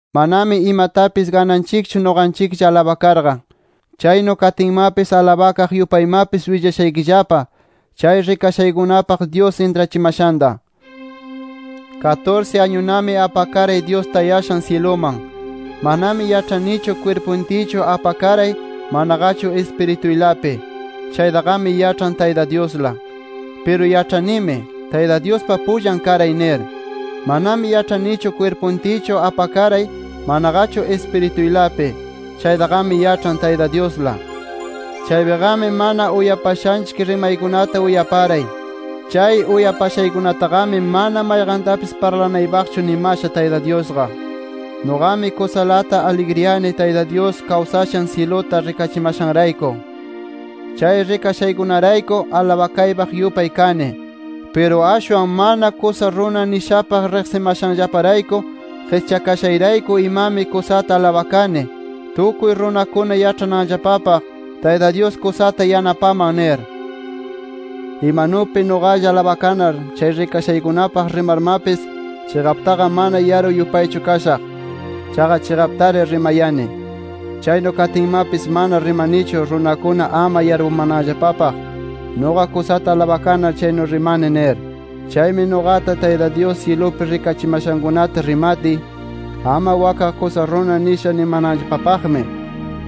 Manami imatapis gananchikchu nuqanchiklla alabakarqa. Chaynu katinmapis alabakaq yupaymapis willashaykillapa, chay rikashaykunapaq Dyus intrachimashanta. Katursi añunami apakaray Dyus tayashan syiluman. Manami yaĉhanichu kwirpuntiychu apakaray, manaqachu Ispirituylapi. Chaytaqami yaĉhan Tayta Dyusla. Piru yaĉhanimi, Tayta Dyuspa pullan karay nir. Manami yaĉhanichu kwirpuntiychu apakaray, manaqachu Ispirituylapi. Chaytaqami yaĉhan Tayta Dyusla. Chaypiqami mana uyapashanchik rimaykunata uyaparay. Chay uyapashaykunataqami mana mayqantapis parlanaypaqchu nimasha Tayta Dyusqa. Nuqami kusalata aligriyani Tayta Dyus kawsashan syiluta rikachimashanrayku. Chay rikashaykunarayku alabakaypaq yupay kani. Piru ashwan mana kusa runa nishapaq riqsimashanllaparayku, qischakashayrayku imami kusata alabakani, tukuy runakuna yaĉhananllapapaq, Tayta Dyus kusata yanapaman nir. Imanupi nuqalla alabakanar chay rikashaykunapaq rimarmapis, chiqaptaqa mana yaru yupaychu kashaq. Chaqa chiqaptari rimayani. Chaynu katinmapis mana rimanichu, runakuna ama yarpunanllapapaq nuqa kusata alabakanar chaynu rimani nir. Chaymi nuqata, Tayta Dyus syilupi rikachimashankunata rimatiy, ama wakqa kusa runa nisha nimananllapapaqmi,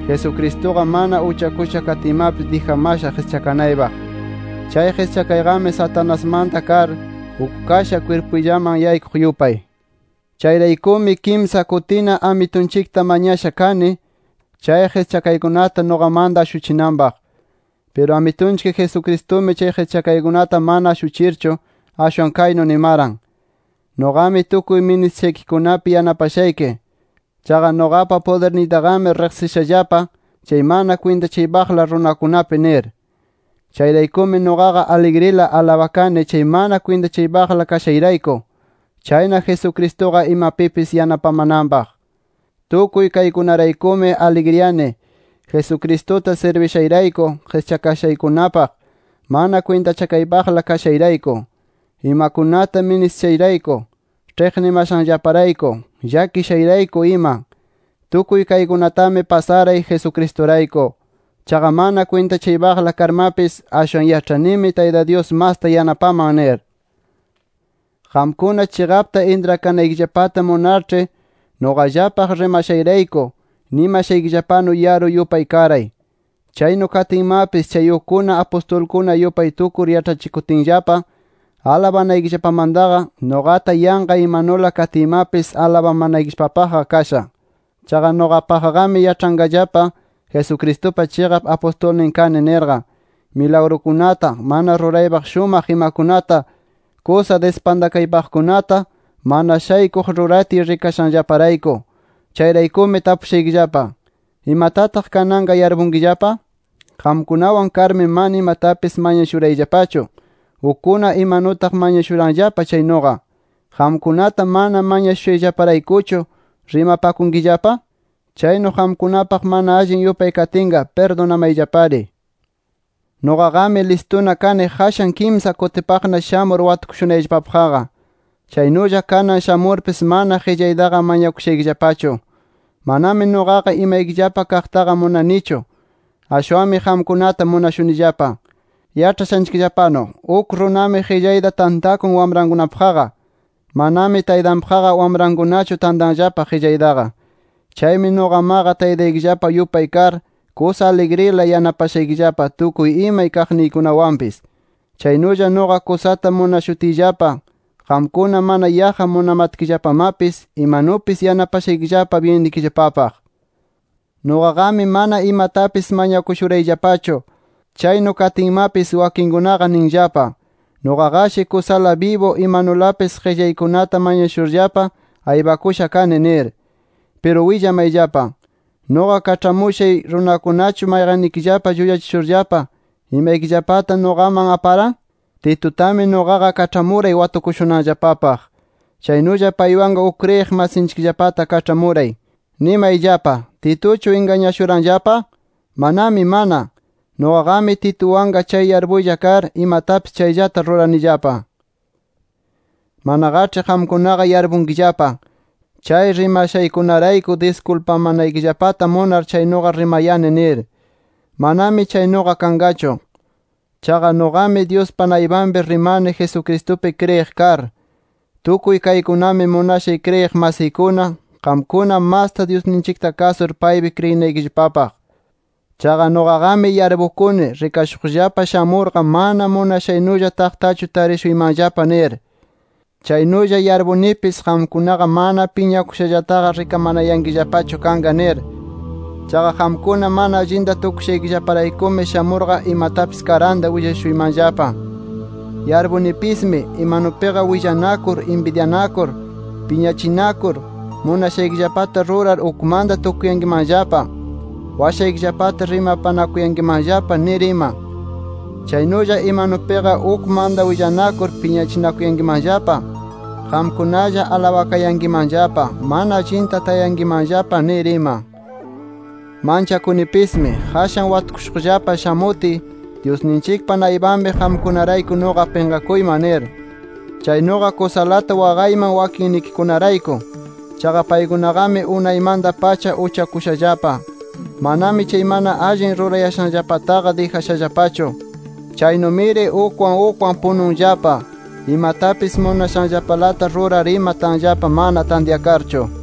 Jesucristuqa mana uchakusha katiymapis dijamasha qischakanaypaq. Chay qischakaymi Satanasmanta kar uk kasha kwirpuyllaman yaykuq yupay. Chayraykumi, kimsa kutina Amitunchikta mañasha kani chay qischakaykunata nuqamanta ashuchinanpaq. Piru Amitunchik Jesucristumi chay qischakaykunata mana ashuchirchu, ashwan kaynu nimaran: “Nuqami tukuy ministishaykikunapi yanapashayki. Chaqa nuqapa pudirniytaqami riqsinllapa, chay mana kwintachaypaqla runakunapi” nir. Chayraykumi nuqaqa aligrila alabakani chay mana kwintachakaypaqla kashayrayku, chayna Jesucristuqa imapipis yanapamananpaq. Tukuy kaykunaraykumi aligriyani, Jesucristuta sirbishayrayku qischakashaykunapaq, mana kwintachakaypaqla kashayrayku, imakunata ministishayrayku, ĉhiqnimashanllaparayku, llakishayrayku ima. Tukuy kaykunatami pasaray, Jesucristurayku. Chaqa mana kwintachakaypaqla karmapis, ashwan yaĉhanimi Tayta Dyus masta yanapaman nir. Qamkuna chiqapta intrakanaykillapata munarĉhi, nuqallapaq rimashayrayku, nimashaykillapanu yaru yupay karay. Chaynu katinmapis, chay ukkuna apustulkuna yupay tukur yaĉhachishutinllapa alabanaykillapamantaqa, nuqata yanqa imanula katiymapis alabamanaykillapapaqqa kasha. Chaqa nuqapaqqami yaĉhanqallapa Jesucristupa chiqap apustulnin kani nirqa, milagrukunata, mana ruraypaq shumaq imakunata, kusa dispantakaypaqkunata, mana shaykuq ruratiy rikashaykillaparayku. Chayraykumi tapushaykillapa: ¿Imatataq kananqa yarpunkillapa? Qamkunawan karmi mana imatapis mañakushurayllapachu, ukkuna imanutaq mañakushuranllapa chaynuqa. ¿Qamkunata mana mañashushayllaparaykuchu rimapakunkillapa? Chaynu qamkunapaq mana allin yupay katinqa, ¡pirdunamayllapari! Nuqaqami listuna kani qashan kimsa kutipaqna shamur watukushunayllapapaqqa. Chaynulla kanan shamurpis mana qillaytaqa mañakushaykillapachu. Manami nuqaqa imaykillapa kaqtaqa munanichu. Ashwanmi qamkunata munashunillapa. Yaĉhashanchikllapanu, uk runami qillayta tantakun wamrankunapaqqa. Manami taytanpaqqa wamrankunachu tantanllapa qillaytaqa. Chaymi nuqamaqa Taytaykillapa yupay kar, kusa aligrila yanapashaykillapa tukuy imay kaqniykunawanpis. Chaynulla nuqa kusata munashutiyllapa, qamkuna mana yaqqa munamatkillapamapis, imanupis yanapashaykillapa byinnikillapapaq. Nuqaqami mana imatapis mañakushurayllapachu. Chaynu katinmatapis wakinkunaqa ninllapa, nuqaqashi kusala bibu imanulapis qillaykunata mañashurllapa aypakusha kani nir. Piru willamayllapa: ¿Nuqa kaĉhamushay runakunachu mayqanninllaqa llullachishurllapa imaykillapata nuqaman aparan? Titutami nuqaqa kaĉhamuray watukushunanllapapaq. Chaynulla paywanqa uk kriyiq masinchikllapata kaĉhamuray. Nimayllapa: ¿Tituchu ingañashuranllapa? ¡Manami mana! Nuqaqami Tituwanqa chay yarpuylla kar, imatapis chayllata ruranillapa. Manaqaĉhi qamkunaqa yarpunkillapa, chay rimashaykunarayku diskulpamanaykillapata munar chaynuqa rimayani, nir. Manami chaynuqa kanqachu. Chaqa, nuqami Dyuspa naypanpi rimani Jesucristupi kriyiq kar. Tukuy kaykunami munashay kriyiq masiykuna, qamkuna masta Dyusninchikta kasur, paypi kriyinaykillapapaq. Chaqa nuqaqami yarpukuni, rikashuqllapa shamurqa mana munashaynulla taqtachu tarishuymanllapa nir. Chaynulla yarpunipis, qamkunaqa mana piñakushallataqa rikamanayankillapachu kanqa nir. Chaqa qamkuna mana allinta tukushaykillaparaykumi, shamurqa imatapis karanta willashuymanllapa. Yarpunipismi, imanupiqa willanakur, inbidyanakur, piñachinakur, munashaykillapata rurar ukmanta tukuyankimanllapa, washaykillapata rimanakuyankimanllapa nir ima. Chaynulla imanupiqa, ukmanta willanakur piñachinakuyankimanllapa, qamkunalla alabakayankimanllapa, mana allinta tayankimanllapa nir ima. Manchakunipismi, qashan watukushuqllapa shamutiy Dyusninchikpa naypanpi qamkunarayku nuqa pinqakuyman nir. Chaynuqa kusalata waqayman wakinnikikunarayku. Chaqa paykunaqami unaymanta-pacha uchakushallapa. Manami chay mana allin rurayashanllapataqa dijashallapachu. Chaynumiri ukwan ukwan pununllapa, imatapis munashanllapalata rurar ima tanllapa mana tantyakarchu.